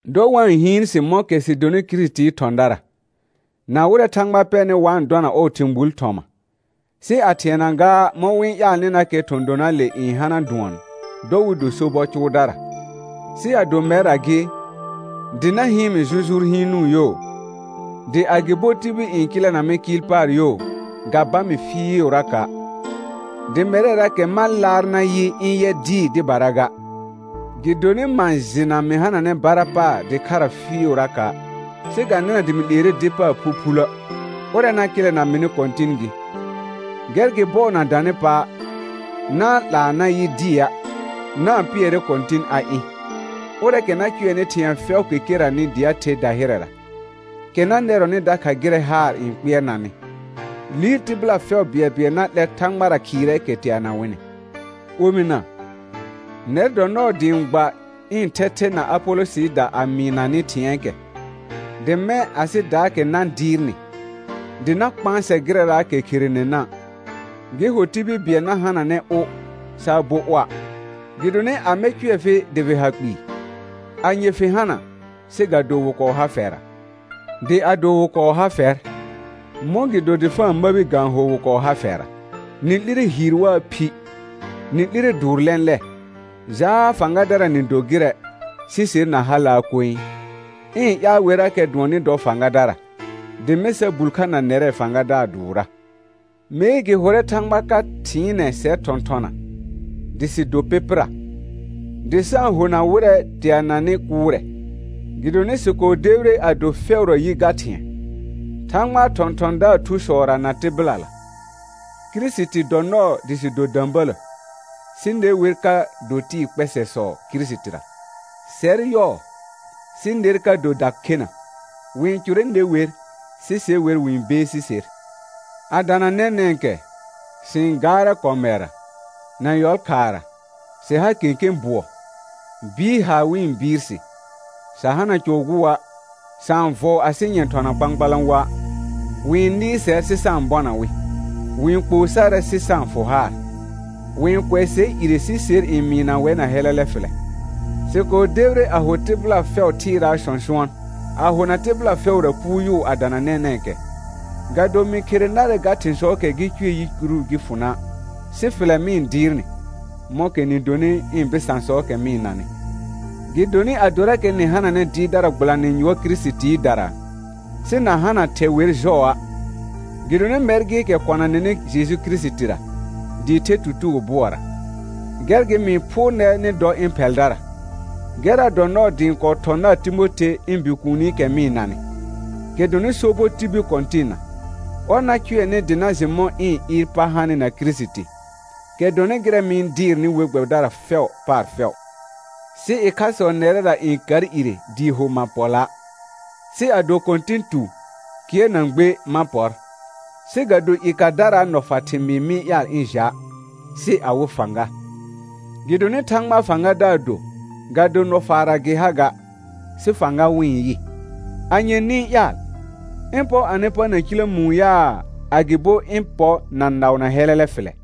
Dɔ wa-n hɩɩn sɩ mɔ̃kɛ sɩ donɩ Kirisitii thɔ̃dara, na wɩrɛ Thãgba pɛrnɩ wa-n dɔna ɔɔ thɩ̃ gbul thɔma; sɩ a thɩɛna gaa mɔ̃ wɩ-n ƴaalnɩnakɛ thɔ̃ donaale n hana dʋɔn, dɔ wɩ do sobɔ cʋʋdara. Sɩ ado mɛrra gɩ, dɩ na hɩɩn mɩ jʋjʋʋr hɩɩnʋʋ yo, dɩ agɩbo tibil n kɩlɛna mɩ kɩɩl paar yo, ga ba mɩ fɩɩʋraka', dɩ mɛrɛrakɛ ma laar nayɩ ɩ̃ yɛ dɩɩ dɩbara ga, gɩdonɩ ma jɩna mɩ hananɛ bara paar dɩkhara fɩɩʋraka'; sɩ ga nɩna dɩ mɩ 'leere dɩ paar phuphulə', ʋrɛ na kɩlɛna mɩnɩ Kɔ̃tɩn gɩ. Gɛr gɩ bɔɔ na danɩ pa', na-n 'laa na yɩ dɩa', na-n pɩɛrɛ Kɔ̃tɩn a ɩ̃, ʋrɛɛkɛ na cʋɛnɩ thɩ̃ɛ fɛʋʋkɛ keranɩ dɩ a the dahɩrɛra, kɛ na nɛrɔnɩ dakha gɩrɛ haar n kpɩɛrnanɩ, liir tɩbɩla fɛʋ bɩɛlbɩɛl na 'lɛ Thãgbara khɩɩrɛɛkɛ teana wɩnɩ. Omɩna, nɛr dɔ nɔɔ dɩ ɩ̃ gba ɩ̃ thɛthɛ na Apolɔsɩɩda a mɩɩna nɩ thɩ̃ɛɛkɛ, dɩ mɛ̃ asɩdaakɛ na dɩɩrnɩ, dɩ na kpãsɛ gɩrɛraakɛ kherenena', gɩ ho tibil bɩɛl na hananɛ ʋ saa bo ʋa'. Gɩdonɩ amɛ cʋɛ fɩ dɩ fɩ ha kpɩɩ? Anye fɩ hana, sɩ ga do wɩ kɔɔ ha fɛra? Dɩ ado wɩ kɔɔ ha fɛr, mɔ̃gɩdo dr fa-n məbi ga-n ho wɩ kɔɔ ha fɛra? Nɩ 'lire hiir waa phi; nɩ 'lire dʋʋr lɛ̃lɛ; jaa fãgadara nɩ do gɩrɛ, sɩ ser na halaa koe. Ɩ̃ ƴaal werrakɛ dʋɔn nɩ dɔ fãgadara, dɩ mɛ̃ sa bul kha na nɛrɛ fãgadaar dʋʋrra. Mee gɩ hʋrɛ Thãgba ka thɩɩnɛ sɛr thɔ̃thɔna, dɩ sɩ do pɩpɩra, dɩ sa-n hona wɩrɛ teananɩ kʋʋrɛ, gɩdonɩ sɩ kɔɔ debire a do fɛʋra yi ga thɩ̃ɛ, Thãgbaa thɔ̃thɔ̃daar thusɔra na tɩbɩlala. Kirisiti dɔ nɔɔ dɩ sɩ do də̃bələ, sɩ ne wer ka do tɩɩ kpɛsɛsɔ Kirisitira; sɛr yɔɔ, sɩ ner ka do dakhena; wɩ-n cʋrɛ ne wer, sɩ se wer wɩ-n beesi ser. A dana nɛnɛ̃kɛ, sɩ-n gaarɛ kɔmɛrra, na yɔlkhaara, sɩ ha kẽkẽ bʋɔ, bɩɩr haar wɩ-n bɩɩr sɩ, sa hana cɔ gʋa'; sa-n vɔɔ asɩ nyɛ̃ thɔna kpãkpalã woa'; wɩ-n nɩɩr sɛr sɩ sa-n bɔna wɩ; wɩ-n kpoo sarɛ sɩ sa-n fʋ haar; wɩ-n kʋɛ sɛr ire sɩ ser n mɩɩna wɛr na hɛlɛlɛ fɩlɛ; sɩ kɔɔ debire a ho tɩbɩla fɛʋ thɩɩraa sɔ̃sʋɔn, a hona tɩbɩla fɛʋra puuyʋʋ a dana nɛnɛ̃kɛ. Ga do mɩ khere narɛ ga thɩ̃sɔɔkɛ gɩ cʋɛ yicuru gɩ fʋ na', sɩ fɩlɛ mɩ-n dɩɩr nɩ, mɔ̃kɛ nɩ donɩ ɩ̃ bɩsãsɔɔkɛ mɩ-n nanɩ. Gɩdonɩ adorakɛ nɩ hananɛ dɩɩrdara gbɩlanɩ yʋɔr Kirisitiidara, sɩ na hana thɛ wer jɔa', gɩdonɩ mɛr gɩɩkɛ kɔna nɩnɩ Jeju Kirisitira, dɩɩ the tutugo bʋɔra. Gɛr gɩ mɩ-n phʋʋr nɛr nɩ dɔ ɩ̃ phɛldara. Gɛrra dɔ nɔɔ dɩ ɩ̃ kɔɔ thɔ̃ nar Timothe ɩ̃ bikuunikɛ mɩ-n nanɩ, kɛ dɔnɩ sobɔ tibil Kɔ̃tɩnna, ɔr na cʋɛ nɩ dɩ na jɩ mɔ̃ ɩ̃ ɩɩr pa hanɩ na Kirisiti, kɛ dɔnɩ gɩrɛ mɩ-n dɩɩrnɩ we gbɛbɩdara fɛʋ paar fɛʋ. Sɩ ɩkhasɔ nɛrɛra n kar ire dɩɩ ho ma pɔ la'. Sɩ ado Kɔ̃tɩn tu, kɩɛr na gbe ma pɔr, sɩ ga do i kadaraa nɔfa thɩmɩɩ mɩ-n ƴaal ɩ̃ ja', sɩ awɩ fãga. Gɩdonɩ Thãgbaa fãgadaar do, ga do nɔfaarra gɩ ha ga, sɩ fãga wɩ-n yɩ. Anye nɩ-n ƴaal? Ɩ̃ pɔ anɩ pa na ciləmũu yaa, agɩbo ɩ̃ pɔ na naʋ na hɛlɛlɛ fɩlɛ?